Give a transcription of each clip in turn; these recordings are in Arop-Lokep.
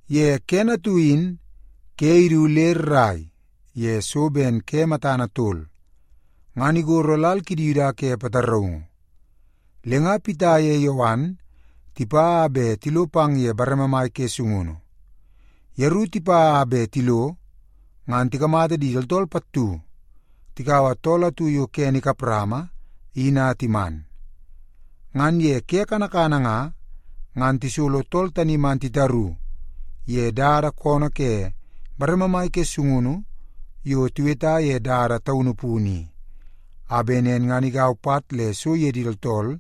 Ye kene atu in ke idu le rrai ye so ben ke matana tol, ngan igoro lal kidi Yuda ke pataraungu. Le nga Pita ye Yowan tipa a bet tilo pang ye bareme mai ke sungunu. Yeru tipa a bet tilo, ngan tikamata di tooltool pattu takaua tool atu yo kene ikap rama in a timan. Ngan ye ke kanakana nga, ngan tisolo tool tani man titaru ye dada koonoo ke bareme mai ke sungunu yo tiweta ye Dada Taunu Punu i, a bet nen igau pat le so ye di tooltool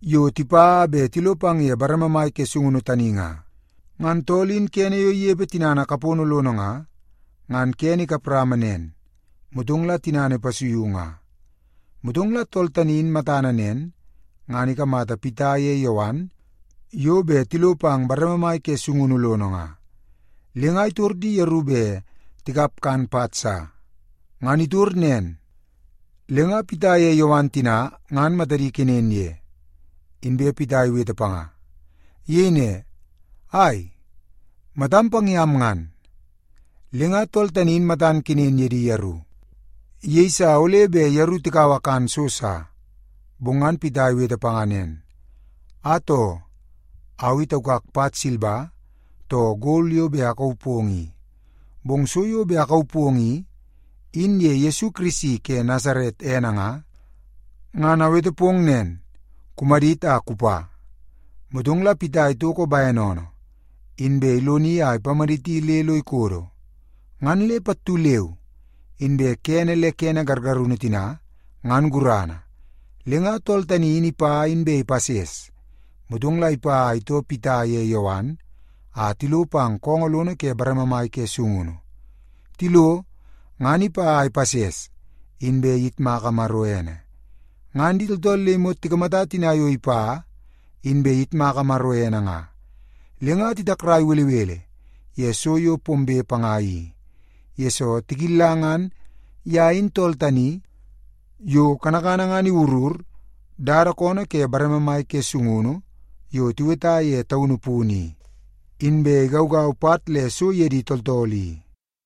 yo tipa a bet tilo pang ye bareme mai ke sungunu tani nga. Ngan tool in kene yo inepe tinana kapono lono nga, ngan kene ikap rama nen, motong la tinana ipasuiu nga. Motong la tool tani in matana nen, ngan ikamata Pita ye Yowan yo bet tilo pang bareme mai ke sungunu lono nga, le nga itor di yeru bet tikap kan pat sa. Ngan itor nen, le nga Pita ye Yowan tina ngan matadi ikenen ye, inbe Pita iwete panga. Iyei ne, “Ai! Matam pang yam ngan!” Le nga tool tani in matan kenen ye di yeru. Iyeisa ole bet yeru tikaua kan so sa. Bong ngan Pita iwete panga nen, “Atoo! Au i taukak pat silba too gol yo bet akauu pong i, bong so yo bet akauu pong i, in ye Yesu Kirisi ke Nasaret ene nga, ngan awete pong nen, kumadit a kupa.” Motong la Pita itoko bene oonoo, inbe iloni a ipamaditi le lo ikodo. Ngan le pattu leu inbe kene le kene gargarunu tina ngan gurana. Le nga tool tani in ipa inbe ipases. Motong la ipa a itoo Pita ye Yowan a tilo pang koongoo lono ke bareme mai ke sungunu nga. Tilo, ngan ipa a ipases, inbe iyitmaka Maro ene. Ngan di tooltool le imot tikamata tina yo ipa inbe iyitmaka Maro ene nga, le nga titakrai belebele ye so yo pombe panga i, yesoo tikilla ngan ye in tool tani yo kanakana ngan iwurur dada koonoo ke bareme mai ke sungunu yo tiweta ye Dada Taunu Punu i, inbe igaugau pat le so ye di tooltool i.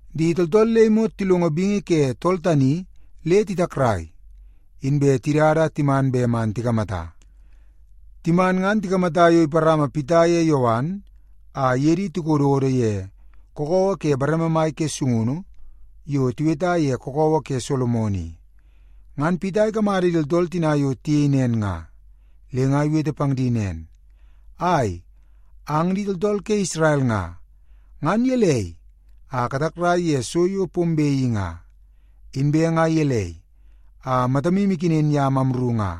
Di tooltool le imot tilongo bingi ke tool tani le titakrai, inbe tidada a timan bet man tikamata. Timan ngan tikamata yo iparama Pita ye Yowan a iye di tikododo ye kakawa ke bareme mai ke sungunu yo tiweta ye Kakawa ke Solomon i. Ngan Pita ikamata di tooltool tina yo tiyei nen nga, le nga iwete pang di nen, “Ai, ang di tooltool ke Isrel nga, ngan gelei a katakrai ye so yo pombe i nga? Inbe nga gelei a matamu ikenen yam amru nga?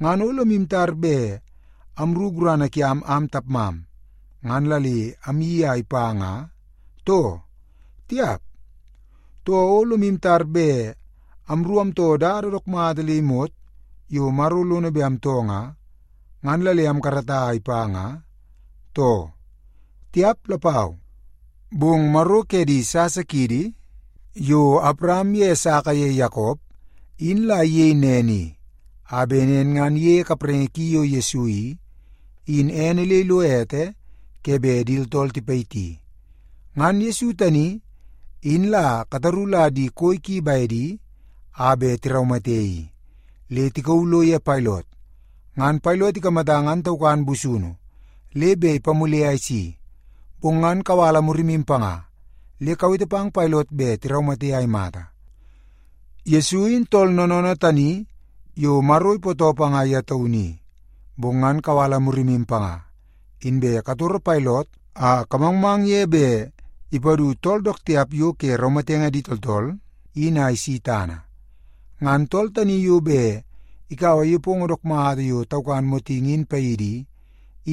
Ngan o lomu tar bet amru gurana kiam am tapmam, ngan la le amyeii a ipa nga, too? Tiap! Too, o lomu tar bet amru amtoo dada dook mata le imot yo Maro lono bet amtoo nga, ngan la le amkarata a ipa nga, too? Tiap lapau! Bong Maro ke di sasa kiidi yo Awaram ye Esaka ye Yakop, in la iyei nen i, a bet nen ngan iyeie kapraingi ki yo Yesu i, in ene le ilo ete ke bet di tooltool tipayiti. Ngan Yesu tani, in la kataru la di koi ki bedi a bet tiraumate i. Le tikauu lo ye Pailot, ngan Pailot ikamata ngan taukan busunu le bet ipamule a isi, bong ngan kawala murimu panga le kawete pang Pailot bet tiraumate a imata. Yesu in tool noonoonoo tani yo Maro ipootoo panga ye taunu i, bong ngan kawala murimu panga, inbe katoro Pailot a kamangmang ye bet ipadu tool dook tiap yo ke raumatenge di tooltool in a isi tana. Ngan tool tani yo bet ikaua nepongo dook mata yo taukan motingi in paidi i,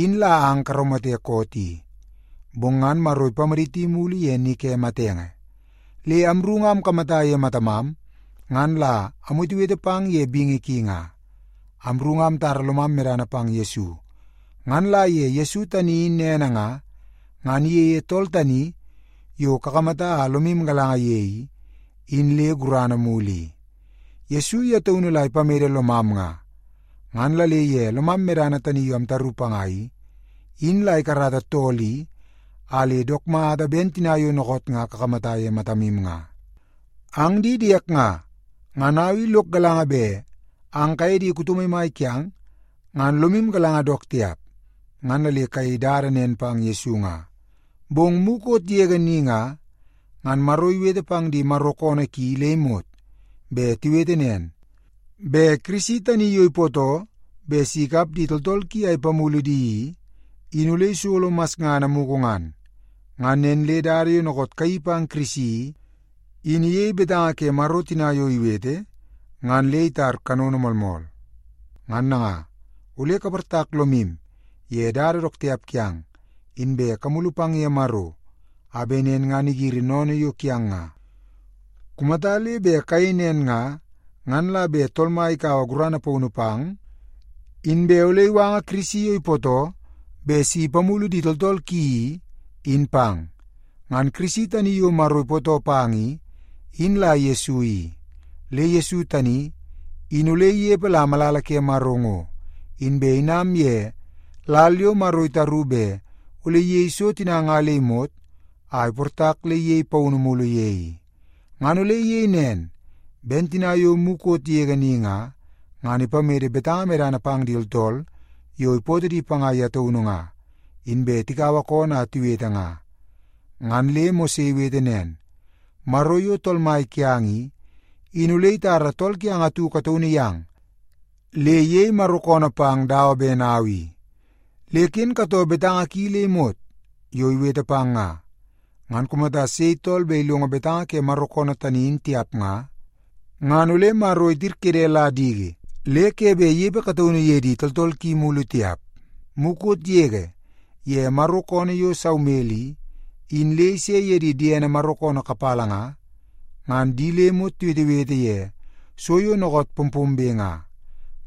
in la ang karaumate koot i. Bong ngan Maro ipamaditi mulu ye ni ke matenge. Le amru nga amkamata ye matamam ngan la amwetewete pang ye bingi ki nga. Amru nga amtara lomam medana pang Yesu, ngan la ye Yesu tani in ene nga, ngan iyeie tool tani yo kakamata a lomu galanga ye i, in le gurana mulu i. Yesu ye taunu la ipamede lomam nga, ngan la le ye lomam medana tani yo amtaru panga i, in la ikarata tool i a le dook mata ben tina yo dookoot nga kakamata ye matamu nga. “Ang di diek nga, ngan au i lok galanga bet ang kaye di kuto maimai kiang, ngan lomu galanga dook tiap, ngan la le kayei dada nen pang Yesu nga. Bong mukot yege ni nga, ngan Maro iwete pang di Maro koonoo ki le imot bet tiwete nen, bet Kirisi tani yo ipootoo bet si ikap di tooltool ki a ipamulu di i, in ole isolo masngana mugu ngan. Ngan nen le dada yo dookoot kayeii pang Kirisi i, in iyei betanga ke Maro tina yo iwete ngan le itar kanono moolmool. Ngan nanga, ole kaportak lomu ye dada dook tiap kiang, inbe kamulu pang ye Maro, a bet nen ngan igiri sennene yo kiang nga. Kumata le bet kayei nen nga, ngan la bet Tool Mai ikaua gurana paunu pang, inbe ole iwanga Kirisi yo ipootoo bet si ipamulu di tooltool ki i, in pang. Ngan Kirisi tani yo Maro ipootoo pang i, in la Yesu i. Le Yesu tani in ole inepe la malala ke Maro ngo, inbe inam ye lal yo Maro itaru bet ole iyei so tina nga le imot a iportak le iyei paunu mulu ye i. Ngan ole iyei nen ben tina yo mukot yege ni nga, ngan ipamede betanga medana pang di tooltool yo ipootoo di panga ye taunu nga, inbe tikaua koonoo a tiwete nga. Ngan le Mose iwete nen, ‘Maro yo Tool Mai kiang i, in ole itara tool kiang atu kataunu yang le iyei Maro koonoo pang dawa ben au i. Le ken katoo betanga ki le imot yo iwete pang nga. Ngan kumata sei tool bet ilongo betanga ke Maro koonoo tani in tiap nga, ngan ole Maro itirkede la diki le ke bet inepe kataunu ye di tooltool ki mulu tiap.’ “Mukot yege ye Maro koonoo yo Saumel i, in le ise ye di diene Maro koonoo kapala nga, ngan di le imot tiwetewete ye so yo dookoot pompombe nga.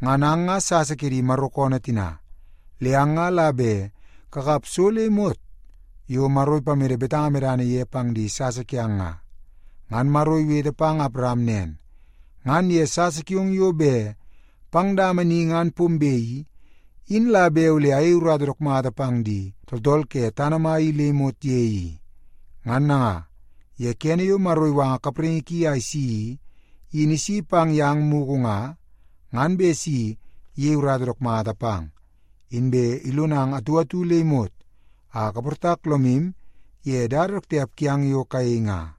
Ngan ang nga sasa ke di Maro koonoo tina, le ang nga la bet kakap so le imot yo Maro ipamede betanga medana ye pang di sasa kiang nga. Ngan Maro iwete pang Awaram nen, ‘Ngan ye sasa kiong yo bet pang dama ni ngan pombe i, in la bet ole ayei urata dook mata pang di tooltool ke tana mai i le imot ye i.’ Ngan nanga, ye kene yo Maro iwanga kapraingi ki a isi i, in isi pang yang mugu nga, ngan bet si iyei urata dook mata pang, inbe ilonang atu atu le imot a kaportak lomu ye dada dook tiap kiang yo kayei nga.”